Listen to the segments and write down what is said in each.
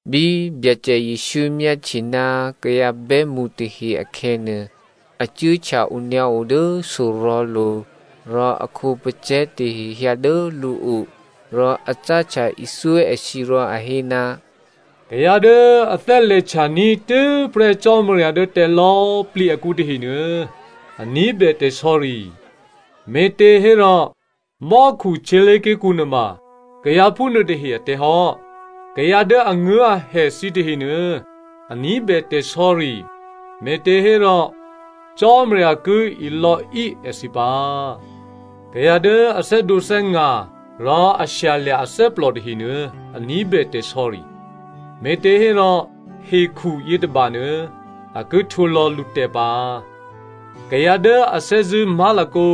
Bí Byacè Jesǔ myáhtye ná kayǎ bè́mṳ tahe akhè̌nuô, a cuốhtya onyǎo dố sorò̤̌lo̤. Rò a khǒpacè̤̌ tahe hyǎ dố lǔo. Rò a cáhtya ithyó èthǐ rò a hé, “Kayǎ dố a thè́lè̤htyaní̤ tû́prè́ Cò́marya dố tè̤lò̌꤮ plǐ akǔ tahenuô, a ní̤bè tè̤sò̌ri. Me̤těhérò mò́khu htyělé̤ké̤kǔ nuôma kayǎ phúnuô tahe atè̤ hò́. Kayǎ dố anguố̤ahè thǐ tahenuô, a ní̤bè tè̤sò̌ri. Me̤těhérò Cò́marya ki ilò̌í èthǐ pǎ. Kayǎ dố a thè́dǒthè́nga̤ rò a shyalya̤ athè́plò tahenuô, a ní̤bè tè̤sò̌ri. Me̤těhérò hekhu yětôbanuô a ki htwǒlò̌ lǔtè̤ pǎ. Kayǎ dố a thè́zṳ̂́ má̤lakǒ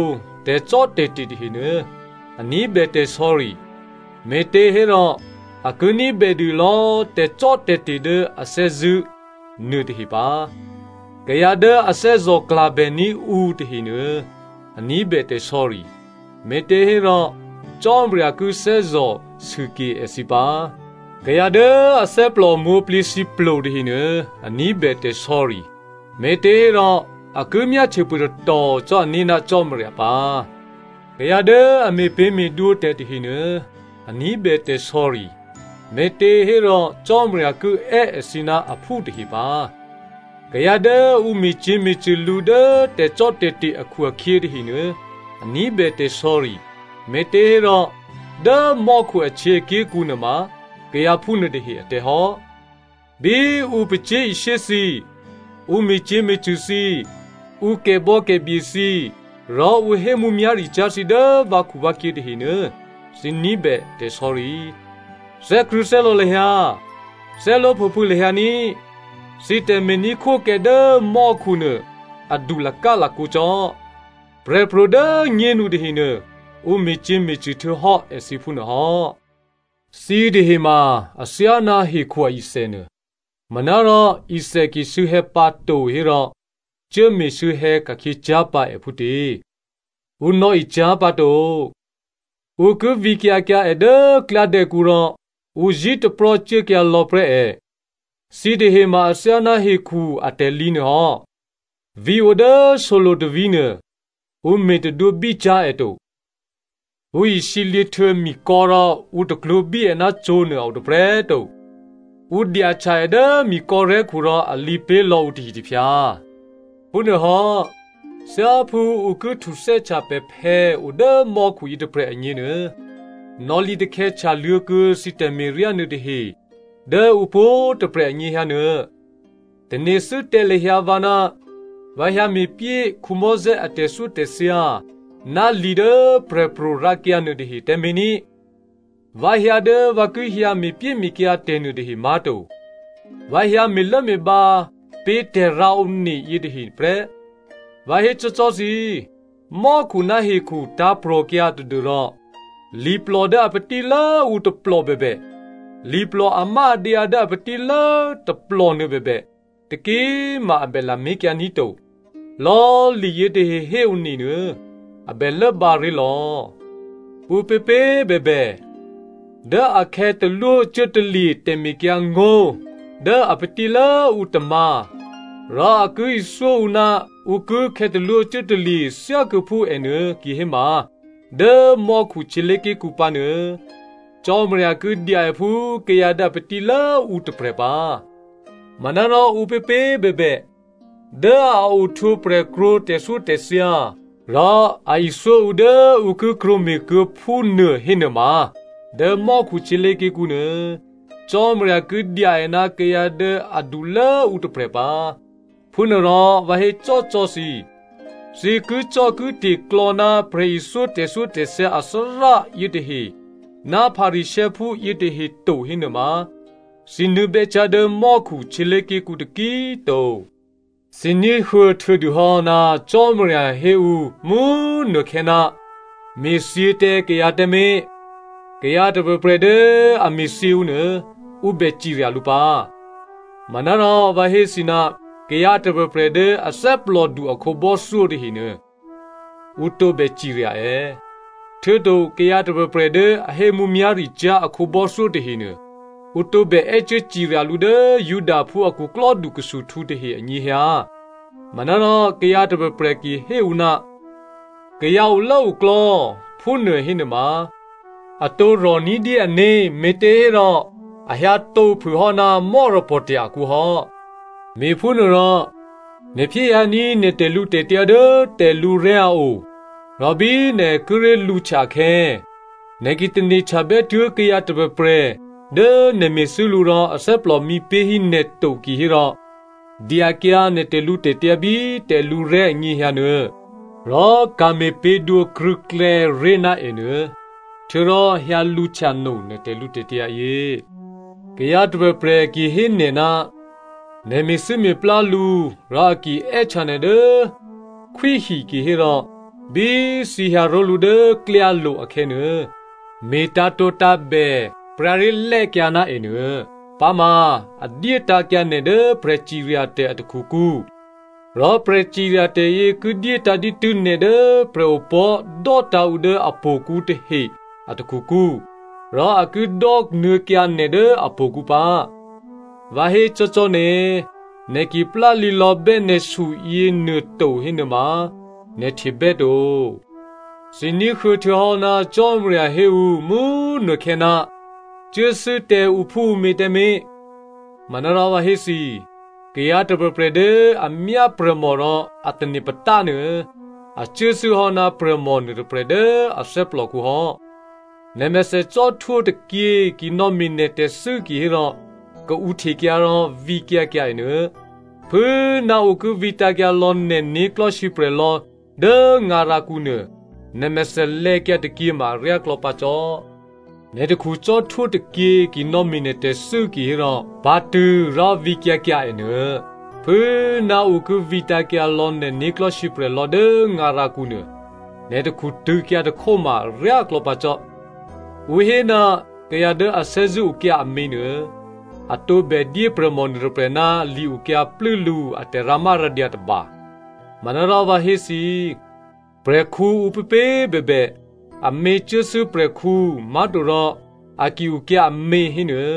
tè̤cò́tè̤te̤ tahenuô, a ní̤bè tè̤sò̌ri, me̤těhérò a ki ní̤bèdû lò̌꤮ tè̤cò́tè̤te̤ dố a thè́zṳ̂́ nuôtahe pǎ. Kayǎ dố a thè́zò̤klabèní̤ ǔ tahenuô, a ní̤bè tè̤sò̌ri. Me̤těhérò Cò́marya ki thè́zò̤ sûke èthǐ pǎ. Kayǎ dố athè́plò mwǒ̤plǐthǐplo tahenuô, a ní̤bè tè̤sò̌ri. Me̤těhérò a ki myáhtye phûtatò cò́ ané̤ ná Cò́marya pǎ. Kayǎ dố a me̤pě̤me̤dwǒ tè̤ tahenuô, a ní̤bè tè̤sò̌ri. Me̤těhérò Cò́marya ki è́ èthǐ ná aphú tahe pǎ. Kayǎ dố ǔ me̤cyě̤me̤cṳ̂ lǔ dố tè̤cò́tè̤te̤ akhu-akhyě tahenuô, a ní̤bè tè̤sò̌ri. Me̤těhérò dố mò́khu ahtyěaké̤kǔ nuôma kayǎ phúnuô tahe atè̤ hò́. “Bí ǔ pacyé̤ishyé thǐ, ǔ me̤cyě̤me̤cṳ̂ thǐ, ǔ kè̤bò̌kè̤bye thǐ rò ǔ hé mǔmyá̤ricyá̤ thǐ dố vǎkhuvǎkhyě tahenuô, thǐ ní̤bè tè̤sò̌ri. Thè́krṳ̂̌thè́lò̌ lahyǎ, thè́luố̤phòphû̌ lahyǎ ní꤮, thǐ tè̤me̤ní̤khwókè dố mò́khu nuô adu lakálakǒ cò́. Prè̤pro̤ dố꤮ nyénu tahenuô ǔ me̤cyě̤me̤cṳ̂ htuô̌hò́ èthǐ phúnuôhò́.” “Thǐ tahe ma athyáná hekhu ithè nuô. Manárò ithè ki sû̌hè̌ pǎto hérò cuốme̤ sû̌hè̌ ka̤khyě cyá̤pǎ è phútě? Ǔ nò̌e cyá̤pǎto. Ǔ ki vǐkyǎ kyǎ è dố klyádè̌kǔ rò ǔ zí̤taprò́ cuốkyǎ lò̌ prè́ è. “Thǐ tahe ma athyáná hekhu atè̤lǐ nuôhò́. Vǐ̤ odố solo̤ tôvǐ̤ nuô ǔ me̤ tadwǒbícyá̤ è to. Ǔ isǐlǐ htuô̌ mikò̌ rò ǔ taklwǒ̤bí è ná cǒ̤nuô a o tôprè̤꤮ to. Ǔ dyahtya è dố mikò̌rè̤́khu rò a lǐ pé̤ lò̌ǔ tôhitôphyǎ. Phúnuôhò́, thyáphú ǔ ki htuthè́htya pè̤phè̌ odố mò́khu yětôprè̤ agněnuô nò̌lǐtakhè̌ htyaluô̌ kuô̌ thǐ tè̤me̤ryá nuôtahe dố ǔ pwǒ̤꤮ tôprè̤ anyěhyǎ nuô.” “Tane̤thû́ tǎ lahyǎ vǎ ná vǎ hyǎme̤pyé Mosè a tè̤thyótè̤thya ná li dố prè̤pro̤ rǎkyǎ nuôtahe tǎmé̤ ní꤮. Vǎ hyǎ dố vǎ ki hyǎ me̤pyéme̤kyǎ tè̤nuô tahe má̤to. Vǎ hyǎ me̤lốme̤bǎ pé̤ tè̤rǎone yětahe nuôprè́. Vǎ hécò́cò́ thǐ, mò́khu ná hekhu tǎ̤prò̤kyǎ tadû́rò, liplò dố a patílốǔ tôplò bèbè, liplò amáadyǎ dố a patílố tôplò nuôbèbè, taki꤮ ma a bè lamé̤kyǎ ní̤ to. Lò̌꤮ liyě tahe héone nuô a bè lốbǎ ré̤lò̌. Ǔpěpě꤮ bèbè, dố a khè̌talwócuốtalye̤ tè̤mekyǎngó̤ dố a patílốǔ tômǎ̤ rò a ki ithyó ǔ ná ǔ ki khè̌talwócuốtalye̤ thyákuô̌phú ènuô kihéma dố mò́khu htyělé̤ké̤kǔ pǎnuô, Cò́marya ki dya è phú kayǎ dố a patílố ǔ tôprè̤ pǎ. Manárò ǔpěpě꤮ bèbè, dố a ohtwǒprè̤ krwǒ tè̤thyótè̤thya rò a ithyó ǔ dố ǔ ki krwǒ me̤kuô̌ phúnuô hénuôma, dố mò́khu htyělé̤ké̤kǔ nuô, Cò́marya ki dya è ná kayǎ dố adulố꤮ ǔ tôprè̤ pǎ. Phúnuôrò vǎ hécò́cò́ thǐ, thǐ kicò́kite̤klò̌ ná prè̤ithyó tè̤thyótè̤thya athárá yětahe ná Pharisěophú yětahe to hénuôma, thǐ nuô̌bè́ cyá̤ dố mò́khu htyělé̤ké̤kǔ taki꤮ to.” “Thǐ ní̤huô̌ htuô̌dûhò́ ná Cò́marya hé ǔ mú꤮ nukhè̌, ‘Me̤thyě tǎ kayǎ tǎmé̤. Kayǎ tôprè̤prè̤ dố a me̤thyě ǔ nuô, ǔ bè cirya lǔ pǎ.’ Manárò vǎ hé thǐ, kayǎ tôprè̤prè̤ dố a thè́plòdu a khǒbò́thyó tahenuô, ǔ tǒbè cirya è. Htuô̌to kayǎ tôprè̤prè̤ dố a hé mǔmyá̤ricyá̤ a khǒbò́thyó tahenuô, ǔ tǒbè è́cuố cirya lǔ dố Judaphú a khuklò́dukhusuhtǔ tahe anyěhyǎ. Manárò kayǎ tôprè̤prè̤ ki hé ǔ, ‘Kayǎ olốoklò̌’ phúnuô hénuôma, a tǒ rò̤ ní̤dyé ané̤, me̤těhérò a hyǎtǒ phûhò́ ná mò́rapò̤tya̤ akǔhò́. “Me̤phúnuôrò, nè̤ phyéhyǎní̤ nè̤ tè̤lǔtè̤tyǎ dố tè̤lǔrè̤́ a o rò bí nè̤ kíré̤ lǔhtya akhè̌, nè̤ ki tane̤htyabètuố̤ kayǎ tôprè̤prè̤ dố nè̤ me̤thû́ lǔ rò athè́plò mǐpé̤hí nè̤ to kihérò, dyakyǎ nè̤ tè̤lǔtè̤tyǎ bí tè̤lǔrè̤́ anyěhyǎ nuô, rò ka̤me̤ pě̤dwǒ krṳ̂̌klè̌ ré̤ ná ènuô. Htuô̌rò hyǎ lǔhtya no nè̤ tè̤lǔtè̤tyǎ yě. “Kayǎ tôprè̤prè̤ ki hé nè̤ ná nè̤ me̤thû́me̤plá lǔ rò a ki è́htya nè̤ dố khwíhi kihérò, bí thǐ hyǎ ró̤lǔ dố klyálo̤ akhè̌nuô, me̤ tǎ̤tǒtǎ̤bè pryǎré̤lè́kyǎ ná ènuô. Pǎma a dyétǎ̤kyǎ nè̤ dố prè̤ciryatè̤ a takhukǔ, rò prè̤ciryatè̤ yě ki dyétǎ̤ dǐtû́ nè̤ dố prè̤opò̤́ dò́tǎ̤ ǔ dố htò̌kǔ tahe a takhukǔ rò a ki dò́nuô̌kyǎ nè̤ dố htò̌kǔ pǎ. Vǎ hécò́cò́ nè̤, nè̤ ki plálǐlò̌bè́ nè̤su yěnuô to hénuôma, nè̤ htebè́ to.” “Thǐ ní̤huô̌ htuô̌hò́ ná Cò́marya hé ǔ mú꤮ nukhè̌, ‘Cuốthû́ tǎ ǔphúǔmě tǎmé̤.’ Manárò vǎ hé thǐ, kayǎ tôprè̤prè̤ dố a myá prè̤mò rò a tane̤ patánuô, a cuốthû́hò́ ná prè̤mò nuôtôprè̤ dố a thè́plòkǔ hò́. Nè̤mèthè cò́htwó tôkyě ki nò̌me̤ nè̤ tè̤thû́ kihérò, kaǔhtekyǎ rò vǐkyǎ kyǎ è nuô. Phû꤮ ná ǔ ki vǐtǎ̤kyǎ lò̌ nè̤ né̤klò̤́ sǐprè̤ lò̌ dố ngarakǔ nuô, nè̤mèthè lè̌kyǎ tôkyě ma aryáklò̌ pǎ cò́. Nè̤ takhu cò́htwó tôkyě ki nò̌me̤ nè̤ tè̤thû́ kihérò, pǎ̤tṳ̂̌ rò vǐkyǎ kyǎ ènuô. Phû꤮ ná ǔ ki vǐtǎ̤kyǎ lò̌ nè̤ né̤klò̤́ sǐprè̤ lò̌ dố ngarakǔ nuô, nè̤ takhu tṳ̂̌kyǎ tôkhó ma aryáklò̌ pǎ cò́.” “Ǔ hé, ‘Kayǎ dố a thè́zṳ̂́ okyǎ amě nuô, a tǒbè dyé prè̤mò nuôtôprè̤ ná li-okyǎ plû́ lǔ a tè̤rǎmárǎdyǎ tôba.’ Manárò vǎ hé thǐ, prè̤khǔ ǔpěpě꤮ bèbè, amě cuốthû́ prè̤khǔ má̤to rò a ki okyǎ amě hénuô,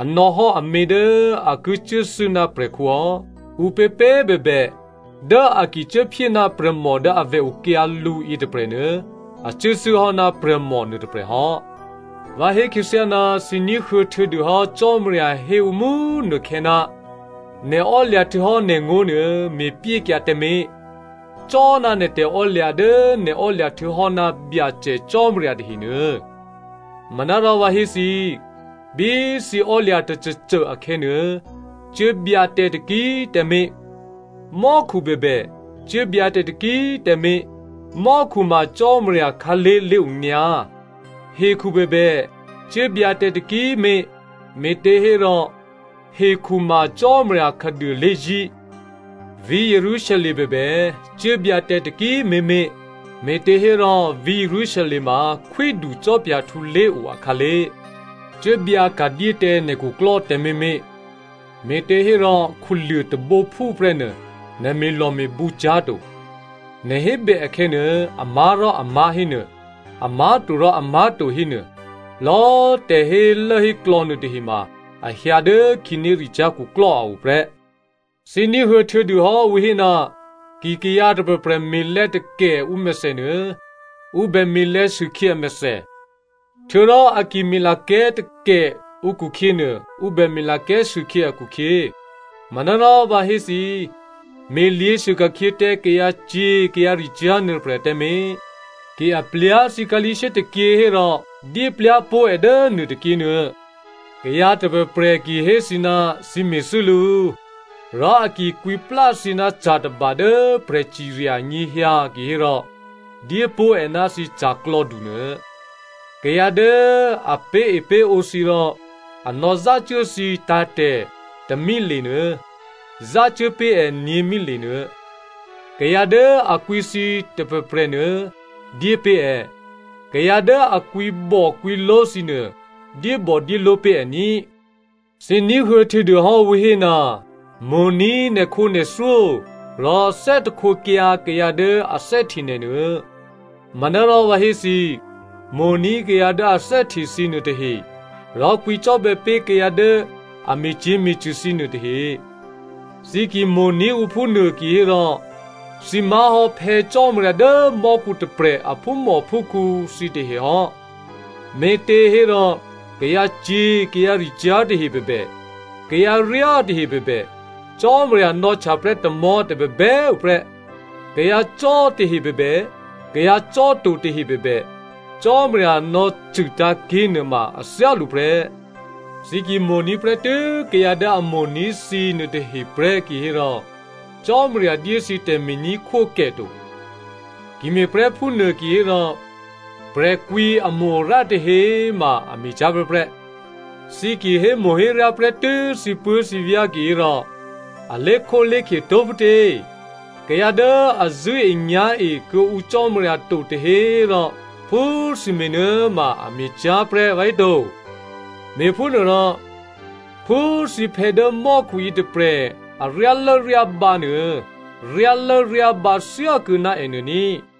a nò̌hò́ amě dố a ki cuốthû́ ná prè̤khǔ hò́. Ǔpěpě꤮ bèbè dố a ki cuốphyé ná prè̤mò dố avè̤ okyǎ lǔ yětôprè̤nuô, a cuốthû́hò́ ná prè̤mò nuôtôprè̤ hò́.” “Vǎ hé khyěthyá, thǐ ní̤huô̌ htuô̌dûhò́ Cò́marya hé ǔ mú꤮ nukhè̌, ‘Nè̤ ò́lya̤ htuô̌hò́ nè̤ngó̤ nuô, me̤pyékyǎ tǎmé̤. Cò́ná nè̤ tè̤ò́lya̤ dố nè̤ ò́lya̤ htuô̌hò́ ná Byacè Cò́marya tahenuô.’ Manárò vǎ hé thǐ, bí thǐ ò́lya̤ tôcôcô akhè̌nuô, cuốbyǎ tǎ taki꤮ tǎmé̤. Mò́khu bèbè, cuốbyǎ tǎ taki꤮ tǎmé̤. Mò́khu ma Cò́marya khǎlé̤ lé̤onyǎ. Hekhu bèbè, cuốbyǎ tǎ taki꤮ mé̤, me̤těhérò hekhu ma Cò́marya khǎduô lé̤zí̤. Vǐ̤ Jerusalem bèbè cuốbyǎ tǎ taki꤮ mé̤mé̤, me̤těhérò vǐ̤ Jerusalem ma khwídu cò́phyahtǔ lé̤o akhǎlé̤. Cuốbyǎ ka̤dyé tǎ nè̤ khuklò́ tǎmé̤mé̤, me̤těhérò khuluô̤ tôbǒphú prè́nuô nè̤ me̤lò̤me̤bǔ cyá̤to. Nè̤ hébè akhè̌nuô, amá̤rò ‘amá̤’ hénuô, amá̤torò ‘amá̤to’ hénuô, lò̌꤮ tè̤hélốhéklò̌ nuôtahe ma a hyǎ dố khǐnéricyá̤ khuklò́ a o prè́.” “Thǐ ní̤huô̌ htuô̌dûhò́ ǔ hé, ‘Ki kayǎ tôprè̤prè̤ me̤lè̌ takè ǔmèthè nuô, ǔ bè me̤lè̌sûkhyě amèthè. Htuô̌rò a ki me̤lakè̤́ takè ǔkhukhyě nuô, ǔ bè me̤lakè̤́sûkhyě akhukhyě.’ Manárò vǎ hé thǐ, me̤lyě̤sû ka̤khyě tǎ kayǎcyě̤ kayǎricyá̤ nuôtôprè̤ tǎmé̤. Ki a plyá̤ thǐ khǎlí̤shyé tôkyě hérò dyé plyá̤ pó̤ è dố nuô tôkyěnuô. Kayǎ tôprè̤prè̤ ki hé thǐ ná thǐ me̤thû́ lǔ, rò a ki kwǐplá thǐ ná ca̤ tôba dố prè̤cirya anyěhyǎ kihérò dyépó̤ è ná thǐ ca̤klò̌du nuô. Kayǎ dố a pé̤epé̤ǒ thǐ rò a nò̌zácuố thǐ tǎ̤tè̤ tômilenuô, zácuố pé̤ è nyě̤mile nuô. Kayǎ dố a kwǐ thǐ tôprè̤prè̤nuô, dyépé̤ è. Kayǎ dố a kwǐbòkwǐló̤ thǐnuô, dyébòdyéló̤ pé̤ è ní꤮.” “Thǐ ní̤huô̌ htuô̌dûhò́ ǔ hé, ‘Mo̤ní̤ nè̤khǒnè̤thyó rò thè́htekyǎ kayǎ dố a thè́hte nè̤ nuô.’ Manárò vǎ hé thǐ, mo̤ní̤ kayǎ dố a thè́hte thǐ nuôtahe rò kwǐcò́bè̌ pé̤ kayǎ dố a me̤cyě̤me̤cṳ̂ thǐ nuô tahe. Thǐ ki mo̤ní̤ ǔ phúnuô kihérò thǐ má̤hò́ Phè̌ Cò́marya dố mò́khu tôprè̤ a phúmòphúkhǔ thǐtahe hò́, me̤těhérò, kayǎcyě̤ kayǎricyá̤ tahe bèbè, kayǎ ryá tahe bèbè, Cò́marya nò̌htyaprè́ tamò̤́ tôbèbè꤮ tuô̌ prè́. Kayǎcò́ tahe bèbè, kayǎ cò́to tahe bèbè, Cò́marya nò̌cṳ̂tǎ̤ ké̤nuô ma a thyálǔ prè́. Thǐ ki mo̤ní̤ prè́tû́ kayǎ dố a mo̤ní̤ thǐ nuôtahe prè́ kihérò Cò́marya dyé thǐ tè̤me̤ní̤khwókè to. Ki me̤prè́ phúnuô kihérò prè̤kwǐamo-arǎ tahe꤮ ma a me̤cyá̤ prè́prè́. Thǐ ki hémo̤héryá prè́tû́ thǐpuố̤thǐvyá̤ kihérò, a lé̤khólé̤khye tó̤ phútě? Kayǎ dố a zṳ̂́enyá̤e kuô̌ǔ Cò́marya to tahe꤮ rò phú thǐ me̤nuô꤮ ma a me̤cyá̤prè́ vǎhéto? Me̤phúnuôrò, phú thǐphè̌ dố mò́khu yětôprè̤ a ryálốryábǎ nuô, ryálốryábǎ thyákuô̌ ná è nuô ní꤮.”